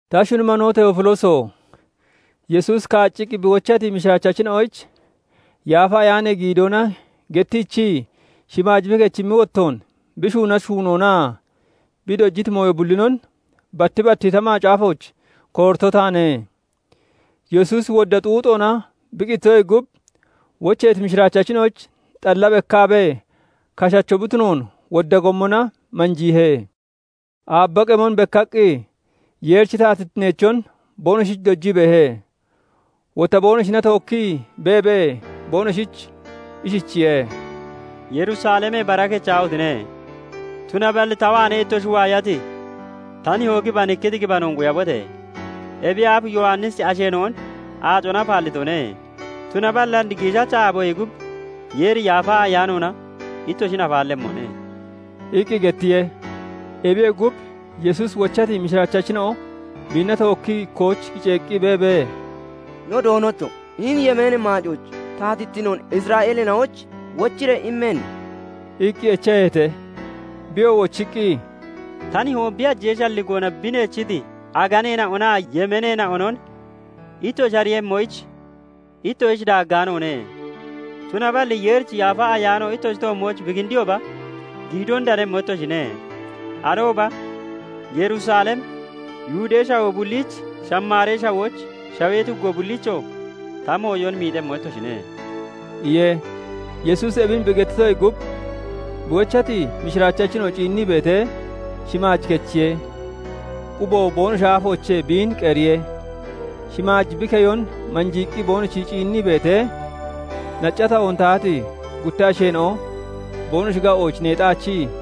Ta shuni manoo Teefilooso! Yesuusi kaacciqqi bi wochati mishiraachachina'oyich Yaafa Ayaanee giidoona gettiichii, shimaaj bi kechimmi wottoon, bi shuunati shuunoonaa bi dojiti mooyo bullinon batti batti ta macaafooch koorito taane. Yesuusi wodda xuuxoona bi qititoyee gub, wocheeti mishiraachachina'oyich xalla bekkaabee kashacho bi tunoon wodda gommona manjiihe. Aabba qemon bekkaqqi, Yeerichi taatittineechon boonoshich dojii beehe. Wotta boonoshina tookkii beebee boonoshich ishichiye; "Yerusalemee bara kechaahotine! Tunaballi ta waanee ittoshi waayati ta Nihoo gibanikkiti gibanoon quyabote! Ebiyee aaf Yowannisi asheena'on aacona afaallitone; tunaballi and giishacha aaboyee gub Yeeri Yaafa Ayaanoona ittoshin afaallemmone" iqqi gettiye. Ebiyee gub, Yesuusi wochati mishiraachachina'o biinna tookkii ikkooch kiceeqqi beebee, "No Doonocho! Hini yemeenee maacooch taatittinoon Isra'eeleena'oyich wochiree immenne?" iqqi echaheete. Biyoo wochiqqi, "Ta Nihoo bi hajee shalligoona bi neechiti aganeena'onaa yemeeneena'onon ittoshi ariiyemmoyich, ittoshich daaggaanoone. Tunaballi Yeerichi Yaafa Ayaano ittoshi toommooch bi kindiyooba, giidoon danemmo ittoshine. Arooba Yerusalem, Yihudee Shawoo bulliich, Shamaaree Shawooch, shawee tuggo bulliichoo ta mooyon miixemmo ittoshine" iye. Yesuusi ebin bi gettitoyee gub, bi wochati mishiraachachina'o ciinnii beetee, shimaaj kechiye; quboo boonoshi aafoochee biin qeriye. Shimaaj bi keyon manjiiqqi boonoshi ciinnii beetee, nacca tahoon tahati gutta asheena'o boonoshi ga'ooch neexaachii,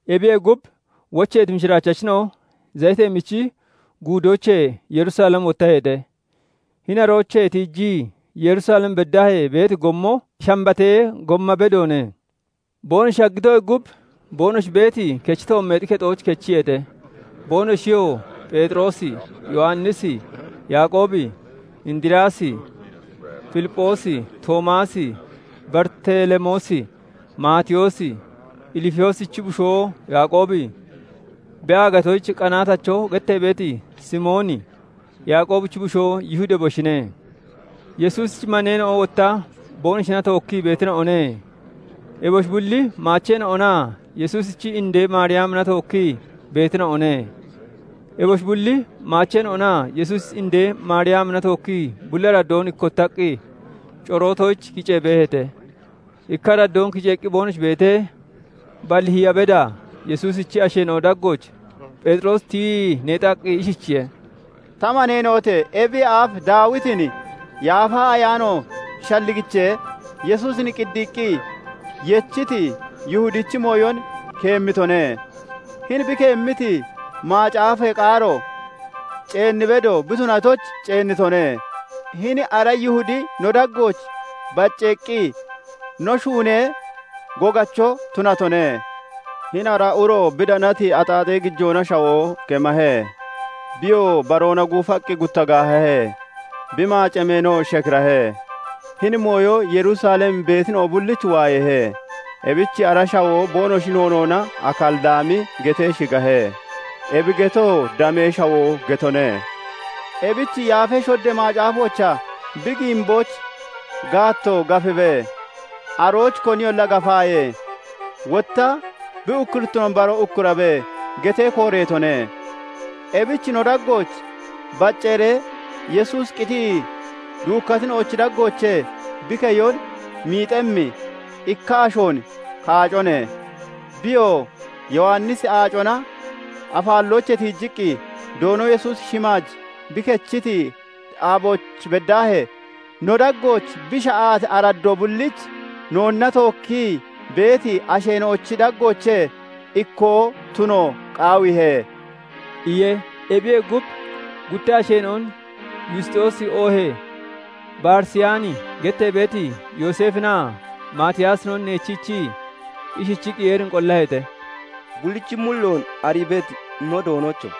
Ebiyee gub, wocheeti mishiraachachina'o Zayitee Michi Guudoochee Yerusalem wottaheete. Hini aroochee tiijii, Yerusalem beddaahee beeti gommo Shanbatee gomma bedoone. Boonoshi shaggitoyee gub, boonoshi beeti, kechi toommeexi kexooch kechiyeete. Boonoshiyoo Pheexiroosi, Yowannisi, Yaaqoobi, Indiriyaasi, Filipphoosi, Toomaasi, Baritelemoosi, Maatiyoosi, Ilfiyoosichi bushoo Yaaqoobi, bi aagatoyich qanaatacho gettee beeti Simooni, Yaaqoobichi bushoo Yihudi, eboshine. Yesuusichi maneena'o wotta boonoshina tookkii beetina'one. Eboshi bulli maacheena'onaa Yesuusichi indee Maariyamina tookkii beetina'one. Eboshi bulli maacheenan'onaa Yesuusichi indee Maariyamina tookkii bulli araddoon ikkottaqqi corootoyich kicee beeheete. Ikka araddoon kiceeqqi boonoshi beetee, balli hiya beda Yesuusichi asheena'o daggooch Pheexiroosi tiyii neexaqqi ishichiye:- "Ta maneena'ote! Ebiyee aaf Daawitin Yaafa Ayaano shalligichee, Yesuusin qiiddiiqqi (maacciqqi) yechiiti Yihudichi mooyon keemmitone. Hini bi keemmiti macaafee qaaro ceenni bedo bi tunatoyich ceennitone. Hini ara Yihudi no daggooch bacceeqqi no shuunee gogacho tunatone. "Hini ara uro bi danati axaaxee gijoona shawoo kemahe. Biyoo baroona guufaqqi gutta gaahahe; bi maacee meenoo shekirahe. Hini mooyo Yerusalem beetina'o bullich waayeehe. Ebich ara shawoo boonoshi noonoona 'Akalidami' getee shigahe. Ebi getoo 'Damee shawoo' getone. "Ebich Yaafa Shoddee Macaafoochaa 'Bi giimbooch gaatto gafibe; arooch koniyolla gafaaye.' Wotta 'Bi ukkurittinoon baroo ukkurabe' getee kooreetone. Ebich no daggooch bacceeree, Yesuusi qitii duukkatina'ochi daggoochee bi keyon miixemmi ikka ashoon kaacone; Biyoo Yowannisi aacona afaalloochee tiijiqqi, Doono Yesuusi shimaaj bi kechiti aabooch beddaahee, no daggooch bi sha'ati araddoo bulliich noonna tookkii beeti asheena'ochi daggoochee ikkoo tuno qaawiihe" iye. Ebiyee gub, gutta asheena'on Yusxoosi oohee Barisiyaani gettee beeti Yooseefinaa Maatiyaasinon neechiichii, ishichiqqi Yeerin qollaheete:- "Bullichi mulloon arii beeti no Doonocho!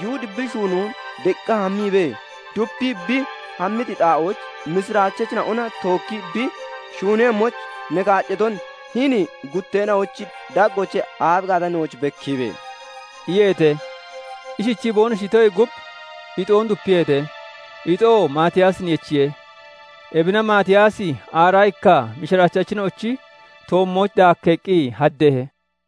Yihudi bi shuunoon deqqa hammiibee, dupii bi hammiti xaa'ooch mishirachachina'ona tookki bi shuunemmoyich, ne kaaccaton hini gutteena'ochi daggoochee aabi gaata nooch bekkiibe!" iyeete. Ishichii boonoshi itoyee gub, ixoon dupiyeete; ixoo Maatiyaasin yechiye; ebina Maatiyaasi aaraa ikka mishiraachachina'ochi toommooch dakkeeqqi haddeehe.